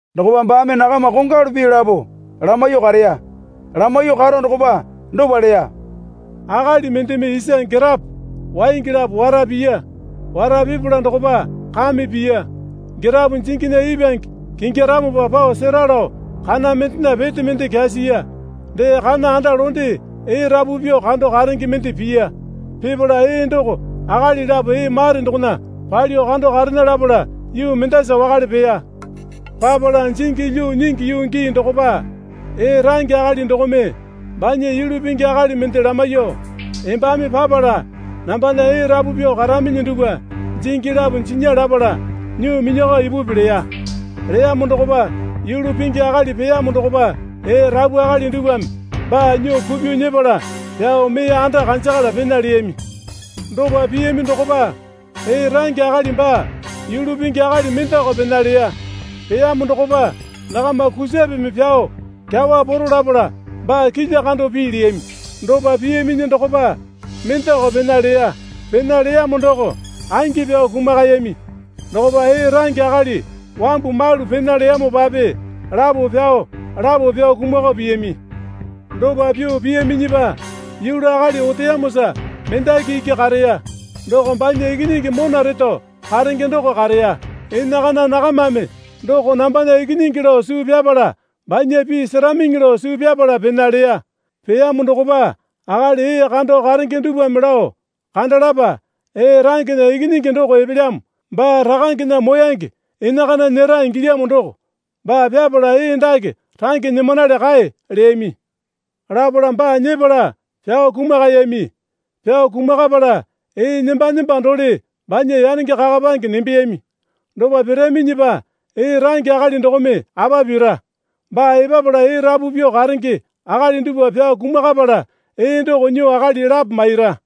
Dokopa baame nakama kongwalu pii lapo lamaiyuo kareya. Lamaiyuo karo dokopa dopa leya. Akali mendeme isa girapo waingi lapo wara piya. Wara pipala dokopa kame piya. Girapo jinginya ipwange kingyaramopa pao sera lao kana mendena pete mende kyasiya. Dee kana anda londe ee rapu pyuo kando karenge mende piya. Pipala ee doko akali lapo ee mare dokona palyuo kando karena lapala yuu mendasa wakale peya. Papala jingi lyuo nyingi yuu gii dokopa ee range akali dokome banya yulu pingi akali mende lamaiyuo, Embame papala nambana ee rapu pyuo karaminyi dupwa jingi lapo jinya lapala nyuo minyakao ipupi, leya. Leyamo dokopa yulu pingi akali peyamo dokopa ee rapu akali dupwame baa nyuo kupyuo nyepala pyao mee anda kanjakala pena leyami. Dopa piyami dokopa ee range akali baa yulu pingi akali mendeko pena leya. Peyamo dokopa nakama kusapeme pyao kyawa poro lapala baa kilya kando pii leyami. Dopa piyaminyi dokopa mendeko pena leya. Pena leyamo doko angi pyao kumakayami. Dokopa ee range akali wambu malu pena leyamopape lapo pyao lapo pyao kumakao piyami. Dopa pyuo piyaminyipa yulu akali oteyamosa mendaki iki kareya. Doko banya ikinyingi mona reto karenge doko kareya. Enakana nakamame doko nambana ikinyingi lao suu pyapala banya pii seramiŋi lao suu pyapala pena leya. Peyamo dokopa akali ee kando karenge dupwame lao, Kandalapa. Ee rangena ikinyingi doko epelyamo. Baa rakangena moyange enakana nyera ingilyamo doko. Baa pyapala ee dake range nyimanale kae, leyami. Lapala baa nyepala pyao kumakayami. Pyao kumakapala ee nemba nemba dole banya yanenge kakapange nembeyami. Dopa piraminyipa ee range akali dokome apa pira? Baa epapala ee rapu pyuo karenge akali dupwa pyao kumakapala ee doko nyuo akali lapo maira.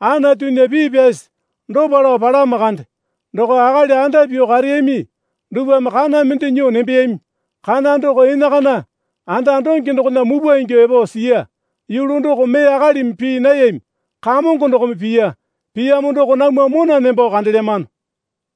Anatunya pii pyasi dopa lao palamo kande, Doko akali anda pyuo kareyami dupwame kana mende nyuo nembeyami. Kana doko enakana anda donge dokona mupwa ingyuo epo siya. Yulu doko mee akalimi pii nayami. Kamongo dokome piya. Piyamo doko namwa mona nembo kandelyamano.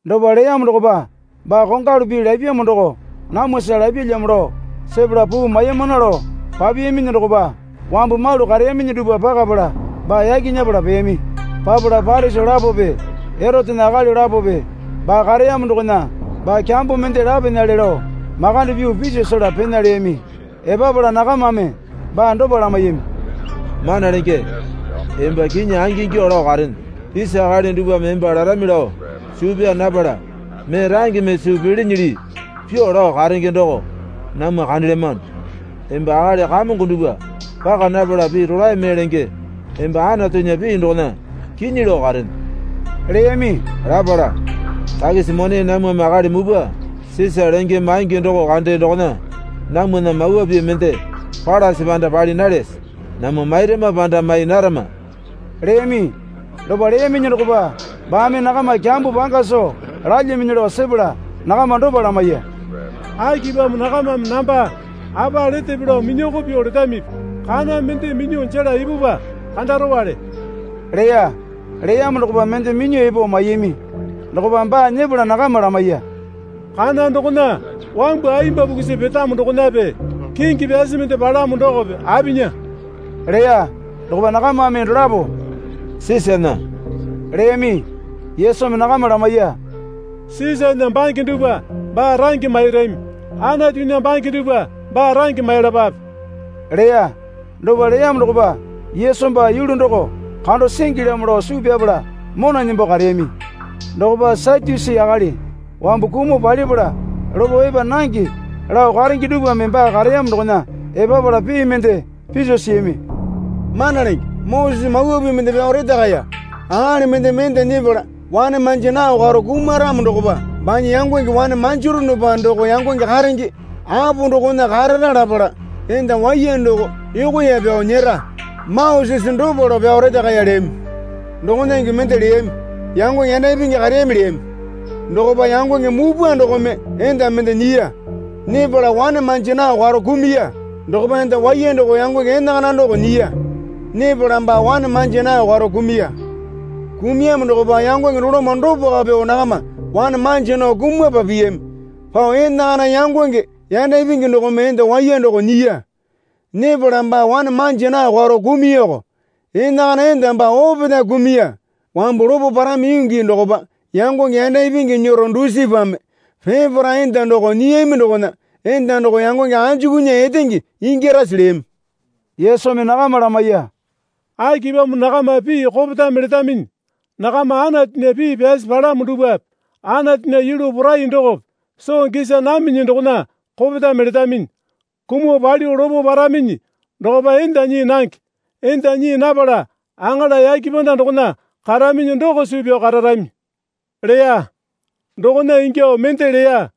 Dopa leyamo dokopa baa kongwalu pii lapyamo doko namwasa lapyalyamo lao sepala puu maimana lao papiyaminyi dokopa wambu malu kareyaminyi dupwa pakapala baa yaki nyepala peyami. Papala Parisi lapope Erotena akali lapope baa kareyamo dokona baa kyambo mende lapenale lao makande pyuo piso sela pena, leyami. Epapala nakamame baa dopa lamaiyami. Mana Lenge, emba kinyi angingyuo lao karene. Isa akali dupwame emba larami lao suu pyaa napala mee rangeme suu pilinyili pyuo lao karenge doko namwa kandelyamano. Emba akali kamongo dupwa paka napala pii rolae mee lenge. Emba Anatunya pii dokona kinyi lao karene, leyami. Lapala, Takisi mone namwame akali mupwa Sisa lenge maingi doko kande dokona namwana Mawa Pii mende palase panda pali nalyase? Namwa mairama panda mai narama? leyami. Dopa leyaminyi dokopa baame nakama kyambo panga soo lalyaminyi lao sepala nakama dopa lamaiya. Akipamo nakamame namba apa letepe lao minyoko pyuo letamipi? Kana mende minyuo jela ipupwa, kandarowale, leya. Leyamo dokopa mende minyuo epo maiyami. Dokopa baa nyepala nakama lamaiya. Kana dokona wambu ayemba pukusi petamo dokonape, kingi pyasi mende palamo dokope apinya? leya. Dokopa nakamame dolapo Sisana, leyami. Yesumi nakama lamaiya. Sisana bange dupwa baa range mairami. Anatunya bange dupwa baa range mailapape, leya. Dopa leyamo dokopa Yesu baa yulu doko kando singilyamo lao suu pyapala mona nembo kareyami. Dokopa Satyusi akali wambu kumuo palipala lopo epa nange lao karenge dupwame baa kareyamo dokona epapala pii mende piso siyami. Mana Lenge, Moseseme mawa pii mende pyao retakaya. Akali mendeme enda nyepala wane manja nao karo kumaramo dokopa banya yangonge wane manjaronopa doko yangonge karenge apo dokona karara lapala enda waiya doko yokoya pyao nyera. Mosese dopa lao pyao retakaya, leyami. Dokona ingyuo mende leyami. Yangonge yanda ipingi kareyami, lami. Dokopa yangonge mupwa dokome enda mende nyiya. Nyepala wane manja nao karo kumuya. Dokopa enda waiya doko yangonge enakana doko nyiya. Nyepala baa wane manja nao karo kumuya. Kumuyamo dokopa yangonge doloma dopako pyuo nakama wane manja nao kumapa piyami pao enakana yangonge yanda ipingi dokome enda waiya doko nyiya. Nyepala baa wane manja nao karo kumuyako. Enakana enda baa opetae kumuya. Wambu lopo parami yuu gii dokopa yangonge yanda ipingi nyero dusipame peparae enda doko nyiyami dokona enda doko yangonge anjukunya etenge ingyarase? leyami. Yesumi nakama lamaiya. Akipamo nakama pii kopetame letaminyi? Nakama Anatunya pii pyasi palamo dupwape Anatunya yulu porai dokope soo gisa naminyi dokona kopetame letaminyi. Kumuo palyuo lopo paraminyi dokopa enda nyii nange. Enda nyii napala aŋala yake panda dokona karaminyi doko suu pyao kararami, leya. Dokona ingyuo mende leya.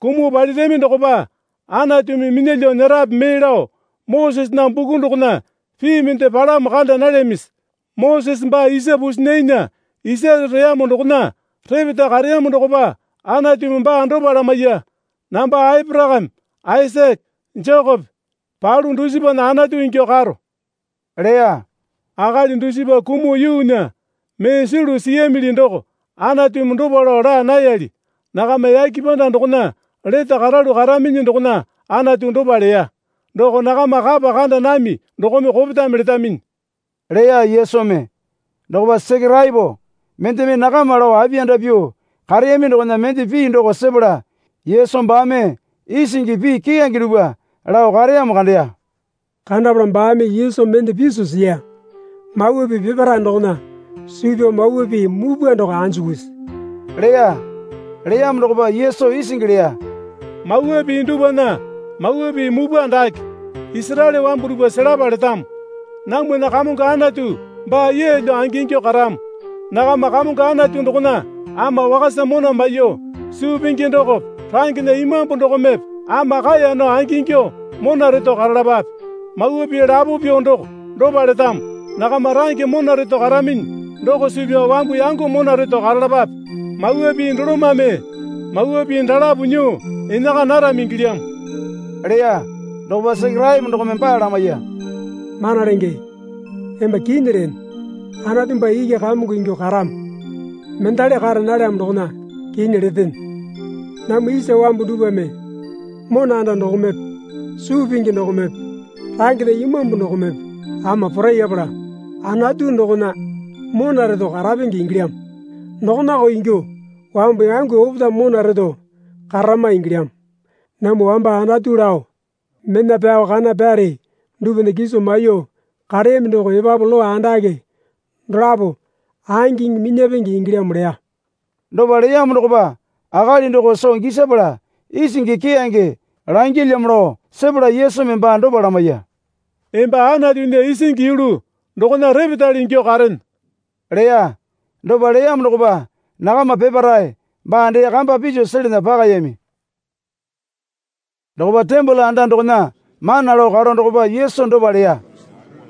Kumuo palirami dokopa Anatumi minyalyuo nyerape mee lao Mosesena buku dokona pii mende palamo kanda nalyamisi? Mosese baa isa pusinainya isare reyamo dokona repeta kareyamo dokopa Anatumi baa dopa lamaiya. Namba Aporakame Aisake Jekope palu dusipana Anatu ingyuo karo, leya. Akali dusipa kumuo yuunya mee sulu siyami doko Anatumi dopa lao laa nayali. Nakama yake panda dokona lete karalu karaminyi dokona Anatu dopa leya. Doko nakama kapa kanda nami dokome kopetame letaminyi, leya Yesumi. Dokopa Sekeraepo mendeme nakama lao apiyanda pyuo kareyami dokona mende pii doko sepala Yesu baame isingi pii keyange dupwa lao kareyamo kandeya. Kandapala baame Yesu mende piso siya. Mawa pii peparae dokona suu pyao mawa pii mupwa doko anjukusi? leya. Leyamo dokopa Yesu isingi leya. Mawa pii dupwana mawa pii mupwa dake, Isaraele wambu dupwa selapa letamo. Namwana Kamongo Anatu baa yeelyo angingyuo karamo. Nakama Kamongo Anatu dokona ama wakasa mona maiyuo, suu pingi dokope rangena imambu dokomepe ama kaeya nao angingyuo mona reto karalapape. Mawa pii lapo pyuo doko dopa letamo. Nakama range mona reto karaminyi doko suu pyao wambu yango mona reto karalapape. Mawa pii dolomame mawa pii dalapo nyuo enaka narami ingilyamo, leya. Dokopa Sekeraepo dokome baa lamaiya. Mana Lenge, emba kinyi lene. Anatu baa iki Kamongo ingyuo karamo, mendali kara nalyamo dokona kinyi letene. Namwa isa wambu dupwame mona anda dokomepe suu pingi dokomepe rangena imambu dokomepe ama porayapala, Anatu dokona mona reto karapenge ingilyamo. Dokonako ingyuo wambu yango opetae mona reto kararama ingilyamo. Namwa wamba Anatu lao mena pyao kana pyare dupwana kiso maiyuo kareyami doko epapu lowa andake dolapo angiŋi minyapenge ingilyamo leya. Dopa leyamo dokopa akali doko soo gisapala isingi keyange langyalyamo lao sepala Yesumi baa dopa lamaiya. Emba Anatunya isingi yulu dokona repetale ingyuo karene, leya. Dopa leyamo dokopa nakama peparae baa dee kamba piso selana pakayami. Dokopa tembole anda dokona mana lao karo dokopa Yesu dopa leya.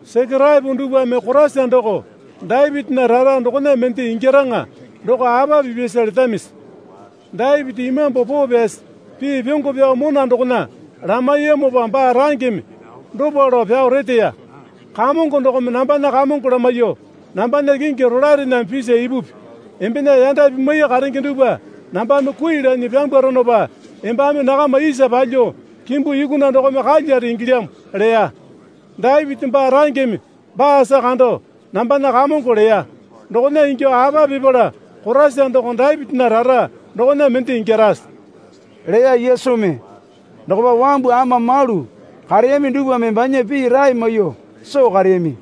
Sekeraepo dupwame Koraisa doko Dapitinya rara dokona mende ingyaraŋa doko apa pipyasa letamisi? Dapiti Imambu Poo Pyasi pii pyongo pyao mona dokona lamaiyamopa baa rangeme dopa lao pyao reteya. Kamongo dokome nambana Kamongo lamaiyuo, Nambana kingi rolaerename pisa ipupi. Embena yanda pimwai karenge dupwa nambame kui lanyi pyambwaronopa embame nakama isa palyuo kimbu yukuna dokome kalyare ingilyamo, leya. Dapiti baa rangeme baasa kando, Nambana Kamongo leya. Dokona ingyuo apa pipala Koraisa doko Dapitinya rara dokona mende ingyarase? leya Yesumi. Dokopa wambu ama malu kareyami dupwame banya pii rae maiyuo soo kareyami.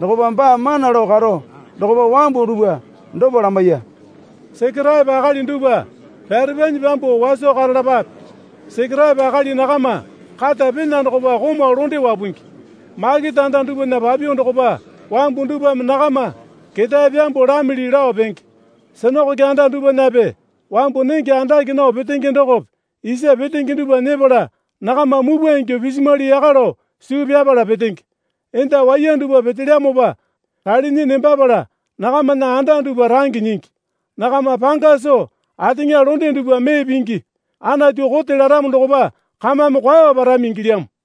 Dokopa baa mana lao karo dokopa wambu dupwa dopa lamaiya. Sekeraepo akali dupwa pyarepanyi pyambuo waso karalapape. Sekeraepo akali nakama kata pena dokopa komau londe wapungi. Makete anda dupwana papyuo dokopa wambu dupwame nakama keta pyambuo lamili lao penge. Sinakoke anda dupwanape wambu nenge andake nao petenge dokope isa petenge dupwa nyepala nakama mupwa ingyuo pisimwali yaka lao suu pyapala petenge. Enda waiya dupwa petelyamopa ralinyi nembapala nakamana anda dupwa range nyingi. Nakama panga soo ateŋa londe dupwa mee pingi. Anatu kote laramo dokopa kamame kwao parami ingilyamo.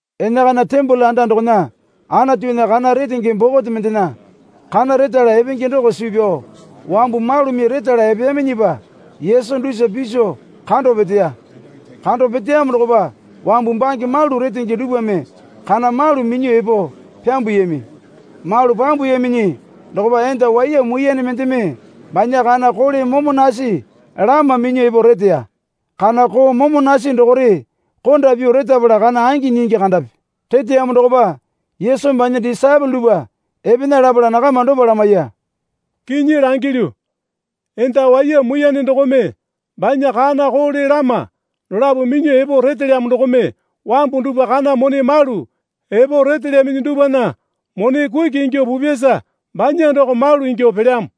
Enakana tembole anda dokona Anatunya kana retenge bokote mendena kana retala epenge doko suu pyao wambu malumi retala epeyaminyipa Yesu dusa piso kando peteya. Kando peteyamo dokopa wambu bange malu retenge dupwame kana malu minyuo epo pyambuyami. Malu pyambuyaminyi dokopa enda waiya muiyane mendeme banya kana koole momo nasi lama minyuo epo reteya. (Kana koo momo nasi dokore konda pyuo retapala kana angi nyingi kandapi.) Reteyamo dokopa Yesumi banya disaepole dupwa epena lapala nakama dopa lamaiya. Kinyi langilyu, enda waiya muiyane dokome banya kana koole lama dolapo minyuo epo retelyamo dokome wambu dupwa kana mone malu epo retelyaminyi dupwana mone kuki ingyuo pupyasa banya doko malu ingyuo pelyamo.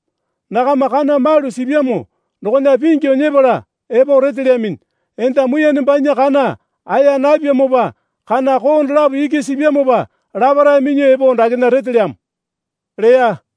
Nakama kana malu sipyamo dokona pingyu nyepala epo retelyaminyi. Enda muiyane banya kana aya napyamopa kana koo dolapo iki sipyamopa laparae minyuo epo dakena retelyamo, leya.